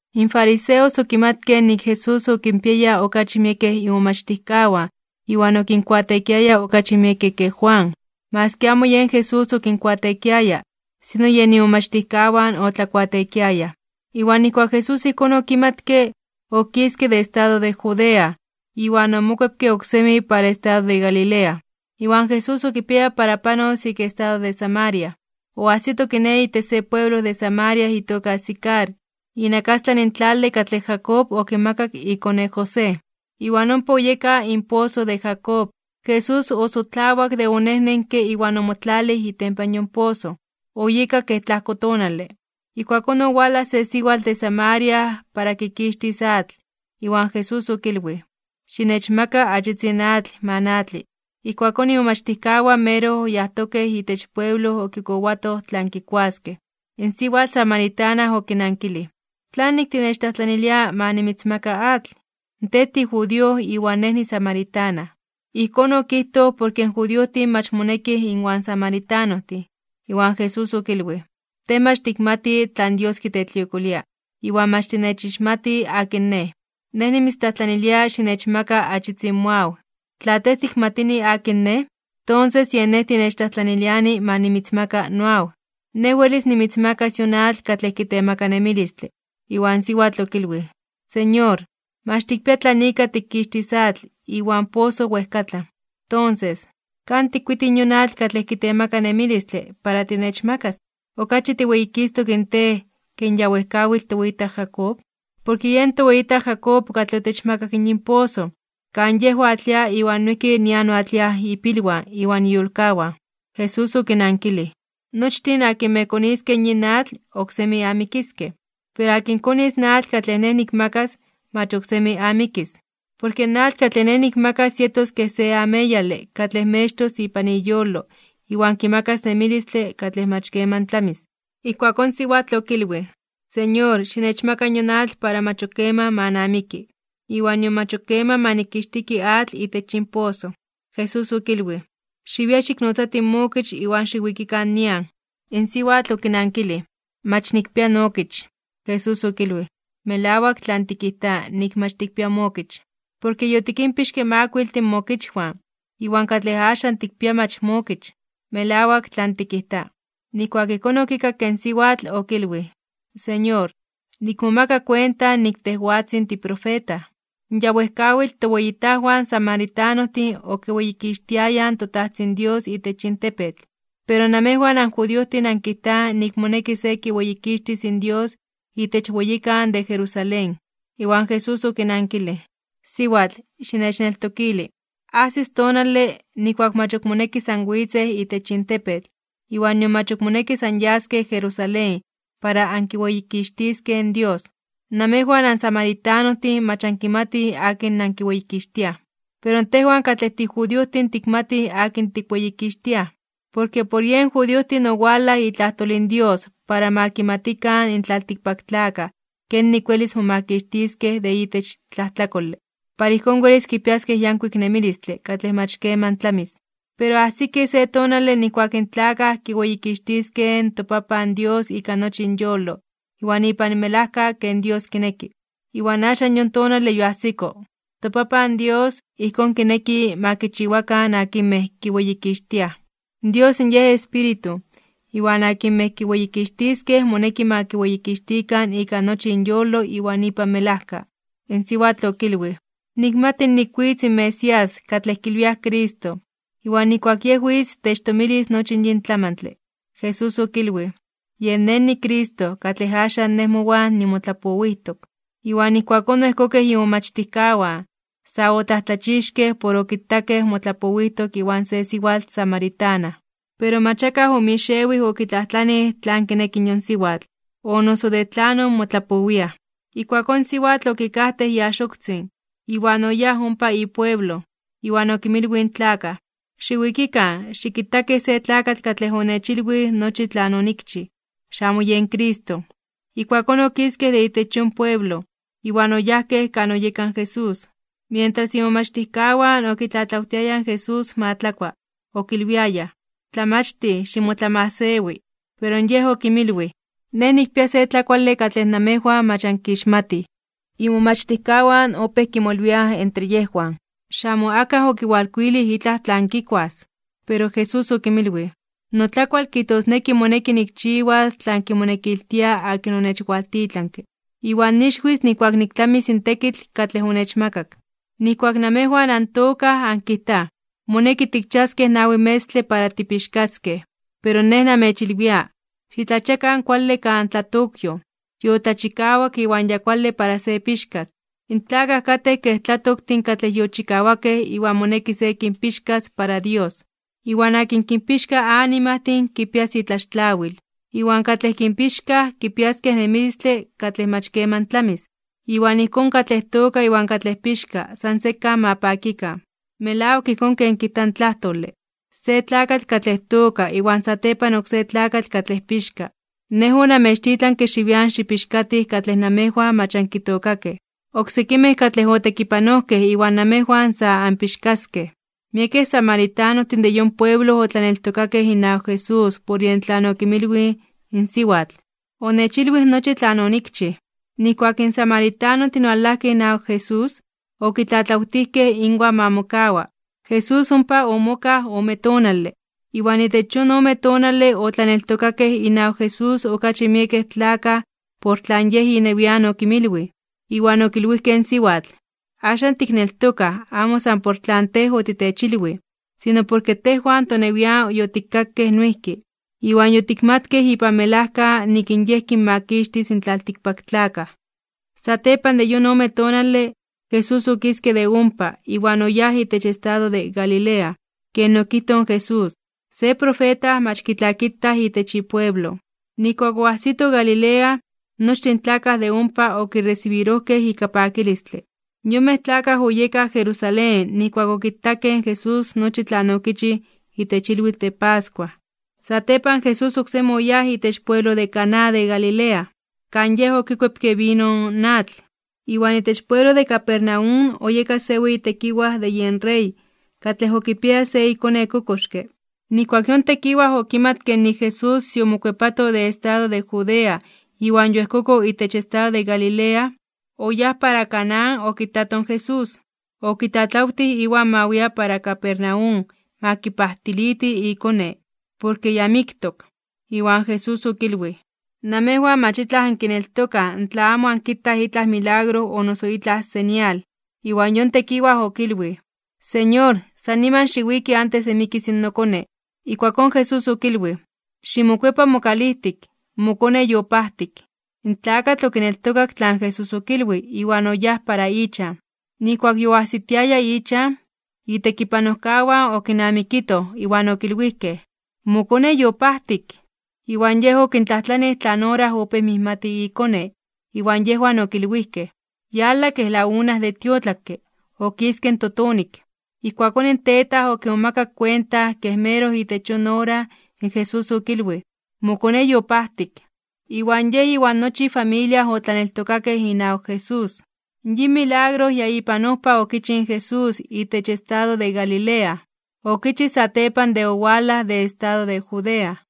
In fariseos okimatkej nik in Jesús okinpiaya okachi miekej imomachtijkawan iwan okinkuateekiaya okachi miekej ke Juan. Maski amo yen Jesús okinkuateekiaya, sino yen imomachtijkawan otlakuateekiayaj. Iwan nijkuak Jesús ijkón okimatke, okiske de estado de Judea, iwan omokuepke oksemi para estado de Galilea. Iwan Jesús okipiaya para panos ik estado de Samaria. Oajsito kiné, itech se pueblo de Samaria itoka Sicar, inakastlan in tlale katlej Jacob okimakak ikone José. Iwan ompa oyeka in poso de Jacob. Jesús osotlawak de onejnenke iwan omotlalij itempan yon poso. Oyeka kej tlajko tonale. Ijkuakón owalaj se siwatl de Samaria para kikixtis atl. Iwan Jesús okilwij: ―Xinechmaka achitzin atl ma natli. Ijkuakón imomachtijkawan meroj yajtokej itech pueblo okikowatoj tlan kikuaskej. In siwatl samaritana okinankilij: ―¿Tlanik tinechtlajtlanilia ma nimitzmaka atl? Tej tijudío iwan nej nisamaritana. (Ijkón okijtoj porke in judiojtin mach monekij inwan samaritanojtin.) Iwan Jesús okilwij: ―Tej mach tikmati tlan Dios kitetliokolia, iwan mach tinechixmati akin Nej. Nej nimitztlajtlanilia xinechmaka achitzin moaw. Tla tej tikmatini akin Nej, tonses yen Nej tinechtlajtlaniliani ma nimitzmaka noaw. Nej welis nimitzmakas yon atl katlej kitemaka nemilistle. Iwan siwatl okilwij: ―Señor, mach tikpia tlan ika tikkixtis atl, iwan in poso wejkatlan. Tonses, ¿kan tikkuiti yon atl katlej kitemaka nemilistle para tinechmakas? ¿Okachi tiweyikistok (tiweyititok) in Tej ke in ya wejkawitl toweyitaj Jacob? Porke yen toweyitaj Jacob katlej otechmakak yin poso, kan yej oatlia iwan noijki nian oatliaj ipilwan iwan iyolkawan. Jesús okinankilij: ―Nochtin akinmej koniskej yin atl, oksemi amikiskej. Pero akin konis in atl katlej Nej nikmakas, mach oksemi amikis. Porke in atl katlej Nej nikmakas yetos kej se ameyale katlej mextos ipan iyolo iwan kimakas nemilistle katlej mach keman tlamis. Ijkuakón in siwatl okilwij: ―Señor, xinechmaka yon atl para mach ok keman ma namiki, iwan nion mach ok keman ma nikixtiki atl itech yin poso. Jesús okilwij: ―Xiwia xiknotzati mookich iwan xiwikikan nian. In siwatl okinankilij: ―Mach nikpia nookich. Jesús okilwij: ―Melawak tlan tikijta nik mach tikpia mookich. Porke yotikinpixke makuiltin mookichwan, iwan katlej axan tikpia mach mookich. Melawak tlan tikijta. Nijkuak ijkón okikakke in siwatl, okilwij: ―Señor, nikmomaka kuenta nik tejwatzin tiprofeta. In ya wejkawitl toweyitajwan samaritanojtin okiweyikixtiayaj in toTajtzin Dios itech yin tepetl, pero namejwan anjudiojtin ankijtaj nik moneki se kiweyikixtis in Dios itech weyikan de Jerusalén. Iwan Jesús okinankilij: ―Siwatl, xinechneltokili. Ajsis tonale, nijkuak mach ok monekis anwitzej itech yin tepetl, iwan nion mach ok monekis anyaskej Jerusalén para ankiweyikixtiskej in Dios. Namejwan ansamaritanojtin mach ankimatij akin nankiweyikixtiaj. Pero tejwan katlej tijudiojtin tikmatij akin tikweyikixtiaj. Porke por yen judiojtin owalaj itlajtol in Dios para ma kimatikan in tlaltikpaktlakaj kenik welis momakixtiskej de itech tlajtlakole, para ijkón welis kipiaskej yankuik nemilistle katlej mach keman tlamis. Pero ajsiki se tonale nijkuak in tlakaj kiweyikixtiskej in toPapan Dios ika nochi inyolo iwan ipan melajka ken Dios kineki, iwan axan yon tonale yoajsiko. ToPapan Dios, ijkón kineki ma kichiwakan akinmej kiweyikixtiaj. Dios Yej Espíritu, iwan akinmej kiweyikixtiskej moneki ma kiweyikixtikan ika nochi inyolo iwan ipan melajka. In siwatl okilwij: ―Nikmati nik witz in Mesías, katlej kilwiaj Cristo. Iwan nijkuak Yej witz techtomilis nochi yin tlamantle. Jesús okilwij: ―Yen Nej niCristo, katlej axan Nej mowan nimotlapowijtok. Iwan ijkuakón oejkokej imomachtijkawan. Sa otlajtlachixkej (omomajmawtijkej) por okitakej motlapowijtok iwan se siwatl samaritana. Pero mach akaj omixewij okitlajtlanij tlan kineki yon siwatl, o noso de tlanon motlapowiaj. Ijkuakón in siwatl okikajtej iaxoktzin, iwan oyáj ompa ipueblo, iwan okinmilwij in tlakaj: ―Xiwikikan, xikitakij se tlakatl katlej onechilwij nochi tlan onikchij. Xamo yen Cristo. Ijkuakón okiskej de itech yon pueblo, iwan oyajkej kan oyeka in Jesús. Mientras, imomachtijkawan okitlatlawtiayaj in Jesús ma tlakua, okilwiayaj: ―Tlamachtij, ximotlamajsewi. Pero Yej okinmilwij: ―Nej nikpia se tlakuale katlej namejwan mach ankixmatij. Imomachtijkawan opéj kimolwiaj entre yejwan: ―¿Xamo akaj okiwalkuilij itlaj tlan kikuas? Pero Jesús okinmilwij: ―Notlakual kijtosneki moneki nikchiwas tlan kimonekiltia akin onechwaltitlanke. Iwan nixwis nijkuak niktlamis in tekitl katlej onechmakak. Nijkuak namejwan antookaj ankitaj: “Moneki tikchiaskej nawi metztle para tipixkaskej.” Pero Nej namechilwia: Xitlachiakan kuale kan tlatokyoj, yotlachikawak iwan ya kuale para se pixkas. In tlakaj katej kej tlatoktin katlej yochikawakej iwan moneki se kinpixkas para Dios. Iwan akin kinpixka animajtin kipias itlaxtlawil, iwan katlej kinpixkaj kipiaskej nemilistle katlej mach keman tlamis. Iwan ijkón, katlej tooka iwan katlej pixka san sekan ma pakikan. Melawak ijkón ken kijta in tlajtole: “Se tlakatl katlej tooka iwan satepan oksé tlakatl katlej pixka.” Nej onamechtitlanke xiwian xikpixkatij katlej namejwan mach ankitookakej. Oksekimej katlej otekipanojkej iwan namejwan sa anpixkaskej. Miekej samaritanojtin de yon pueblo otlaneltokakej inawak Jesús por yej tlan okinmilwij in siwatl: “Onechilwij nochi tlan onikchij.” Nijkuak in samaritanojtin owalajkej inawak Jesús, okitlatlawtijkej inwan ma mokawa. Jesús ompa omokaj ome tonale. Iwan itech yon ome tonale otlaneltokakej inawak Jesús okachi miekej tlakaj por tlan Yej inewian okinmilwij. Iwan okilwijkej in siwatl: ―Axan tikneltokaj amo san por tlan tej otitechilwij, sino porke tejwan tonewian yotikkakej noijki, iwan yotikmatkej ipan melajka nik Yej kinmakixtis in tlaltikpaktlakaj. Satepan de yon ome tonale, Jesús okiske de ompa, iwan oyáj itech estado de Galilea. Ken okijtoj in Jesús, se profeta mach kitlakitaj itech ipueblo. Nijkuak oajsito Galilea, nochtin in tlakaj de ompa okiresibirojkej ika pakilistle. Yonmej tlakaj oyekaj Jerusalén nijkuak okitakej in Jesús nochi tlan okichij itech ilwitl de pascua. Satepan Jesús oksemi oyáj itech pueblo de Caná de Galilea, kan Yej okikuepke vino in atl. Iwan itech pueblo de Capernaum oyeka se weyi tekiwaj de yen rey, katlej okipiaya se ikone kokoxke. Nijkuak yon tekiwaj okimatke nik in Jesús yomokuepato de estado de Judea iwan yoejkoko itech estado de Galilea, oyáj para Caná okitato in Jesús. Okitlatlawtij iwan ma wia para Capernaum ma kipajtiliti ikone, porke yamiktok. Iwan Jesús okilwij: ―Namejwan mach itlaj ankineltokaj tla amo ankitaj itlaj milagro o noso itlaj señal. Iwan yon tekiwaj okilwij: ―Señor, san niman xiwiki antes de mikis nokone. Ijkuakón Jesús okilwij: ―Ximokuepa mokalijtik, mokone yopajtik. In tlakatl okineltokak tlan Jesús okilwij, iwan oyáj para ichan. Nijkuak yoajsitiaya ichan, itekipanojkawan okinamikitoj, iwan okilwijkej: ―¡Mokone yopajtik! Iwan yej okintlajtlanij tlan ora opéj mijmati ikone, iwan yejwan okilwijkej: ―Yala kej la una de tiotlakke, okiske in totonik. Ijkuakón in tetaj okimomakak kuenta ke meroj itech yon ora in Jesús okilwij: “Mokone yopajtik.” Iwan yej iwan nochi ifamilia otlaneltokakej inawak Jesús. Yin milagro ya ipan ojpa okichij in Jesús itech estado de Galilea, okichij satepan de owalaj de estado de Judea.